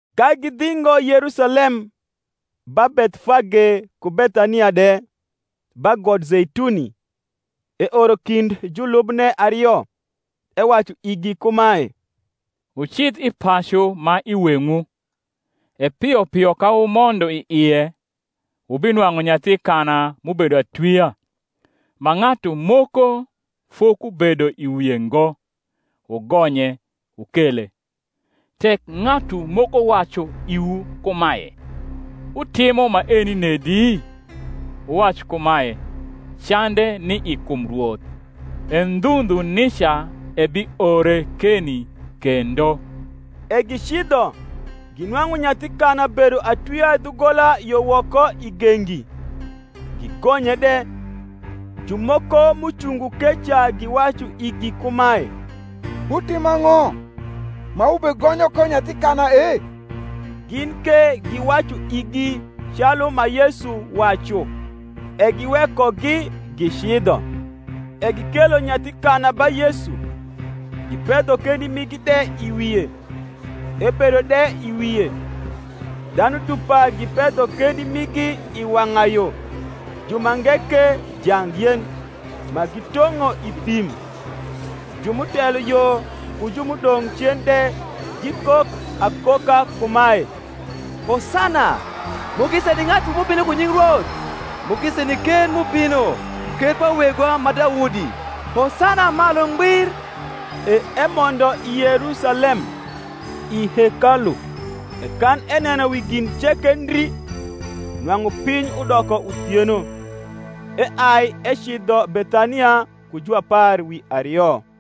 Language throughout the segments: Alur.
Ka gidhingo Yerusalem, ba Bethfage ku Bethania de, ba got Zeituni, eoro kind julubne ario, ewacu igi kumae, Wucidh i pacu ma i weng’wu: e pio pio ka wumondo i ie, wubinwang’u nyathi kana m’ubedo atwia, ma ng’atu moko fokubedo i wie ngo; wugonye, wukele. Tek ng’atu moko wacu iwu kumae, Wutimo maeni nedi? wuwac kumae, Cande ni i kum Rwoth; e ndhu ndhu nica ebiore keni kendo. E gicidho, ginwang’u nyathi kana bedo atwia dhugola yo woko i gengi; gigonye de. Jumoko m’ucungo keca giwacu igi kumae, Wutimo ang’o, ma wubegonyo ko nyathi kana e? Gin ke giwacu igi calu ma Yesu wacu: e giwekogi gicidho. E gikelo nyathi kana ba Yesu, gipedho kendi migi de i wie; ebedo de i wie. Dhanu dupa gipedho kendi migi i wang’ayo; jumange ke jangyen, ma gitong’o i thim. Ju m’utelo yo, ku ju m’udong’ cen de, gikok akoka kumae, Hosana; mugisa ni ng’atu m’ubino ku nying Rwoth: Mugisa ni ker m’ubino, ker pa wegwa ma Daudi: Hosana malu ngbir. E emondo i Yerusalem, i hekalu; e kan eneno wi gin ceke ndri, nwang’u piny udoko uthieno, eai ecidho Bethania ku juapar wi ario.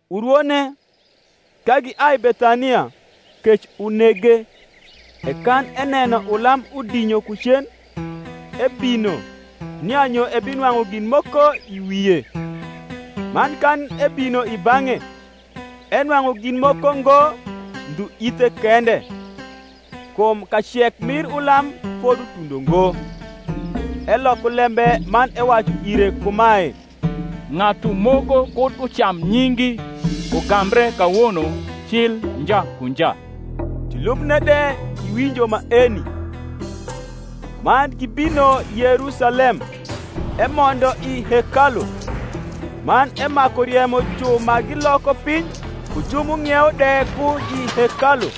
Urwone, ka giai Bethania, kec unege. E kan eneno ulam udinyo ku cen, ebino, nia nyo ebinwang’u gin moko i wie: man kan ebino i bang’e, enwang’u gin moko ngo ndhu ithe kende; kum kacek mir ulam fodutundo ngo. Eloko lembe man ewacu ire kumae, Ng’atu moko kud ucam nyingi ugambre kawono cil nja ku nja. Julubne de giwinjo maeni. Man gibino Yerusalem, emondo i hekalu, man emaku riemo ju ma giloko piny ku ju m’ung’iewo de ku i hekalu,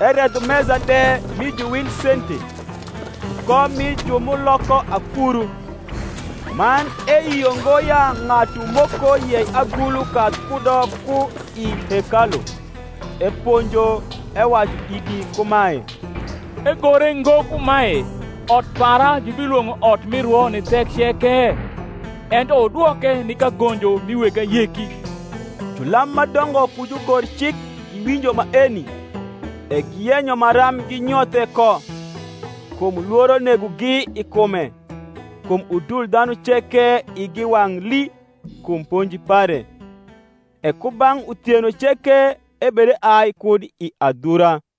eredho mesa de mi juwilsente, ku kom mi ju m’nioko akuru; man eyio ngo ya ng’atu moko yei agulu kadh kudo ku i hekalu. Eponjo, ewacu igi kumae, Egore ngo kumae, Ot para jubilwong’o ot mi rwo ni thek ceke? ento wudwoke ni kagonjo mi weg ayeki. Julam ma dongo ku jugorcik giwinjo maeni, e giyenyo maram ginyothe ko: kum lworo negogi i kume, kum udul dhanu ceke igi wang’ lii kum ponji pare. E ku bang’ uthieno ceke ebedeai kud i adhura.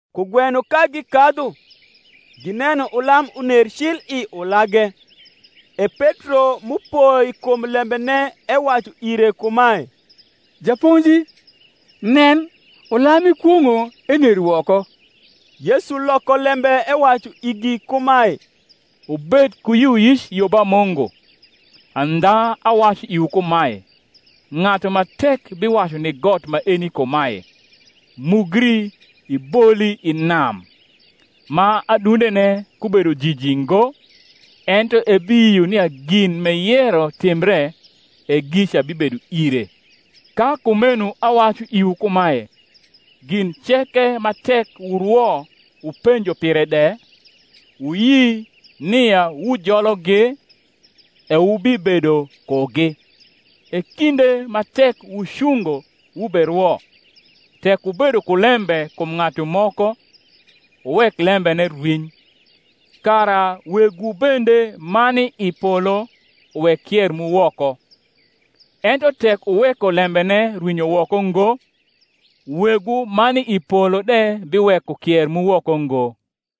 Kugweno ka gikadhu, gineno ulam uner cil i ulage. E Petro m’upoi kum lembene ewacu ire kumae, Japonji, nen, ulam m’ikwong’o ener woko. Yesu loko lembe ewacu igi kumae, Wubed ku yioyic yo ba Mungu. Andha awacu iwu kumae, Ng’atu ma tek biwacu ni got maeni kumae, Mugri iboli i nam, ma adundene kubedo jiji ngo, ento ebiyio nia gin m’eyero timbre, e gica bibedo ire. Ka kumeno awacu iwu kumae, Gin ceke ma tek wurwo wupenjo pire de, wuyi nia wujologi, e wubibedo kugi. E kinde ma tek wucungo wuberwo, tek wubedo ku lembe kum ng’atu moko, wuwek lembene rwiny; kara Wegwu bende ma ni i polo uwek kier mu woko. Ento tek wuweko lembene rwinyo woko ngo, Wegwu ma ni i polo de biweko kier mu woko ngo.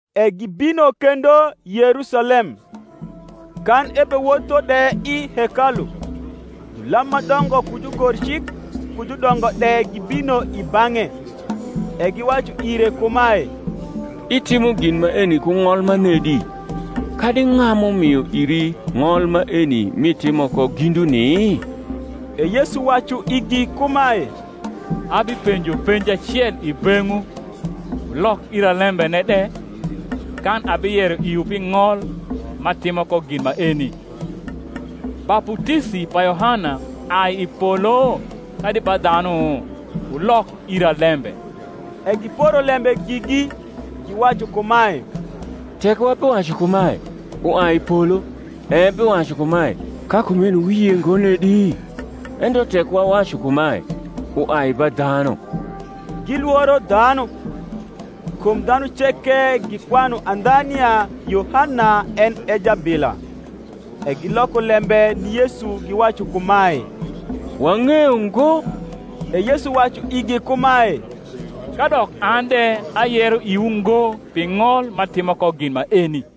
E gibino kendo Yerusalem: kan ebewotho de i hekalu, julam ma dongo ku jugorcik ku judongo de gibino i bang’e; e giwacu ire kumae, Itimo gin maeni ku ng’ol manedi? kadi ng’a m’umio iri ng’ol maeni m’itimo ko ginduni? E Yesu wacu igi kumae, Abipenjo penji acel i beng’wu, wulok ira lembene de, kan abiyero iwu pi ng’ol m’atimo ko gin maeni. Baputisi pa Yohana ai i polo, kadi ba dhanu? wulok ira lembe. E giporo lembe gigi, giwacu kumae, Tek wabiwacu kumae, Uai i polo; ebiwacu kumae, Ka kumeno wuyie ngo nedi? Ento tek wawacu kumae, Uai ba dhanu, gilworo dhanu: kum dhanu ceke gikwanu andha nia Yohana en e jabila. E giloko lembe ni Yesu giwacu kumae, Wang’eyo ngo. E Yesu wacu igi kumae, Kadok an de ayero iwu ngo pi ng’ol m’atimo ko gin maeni.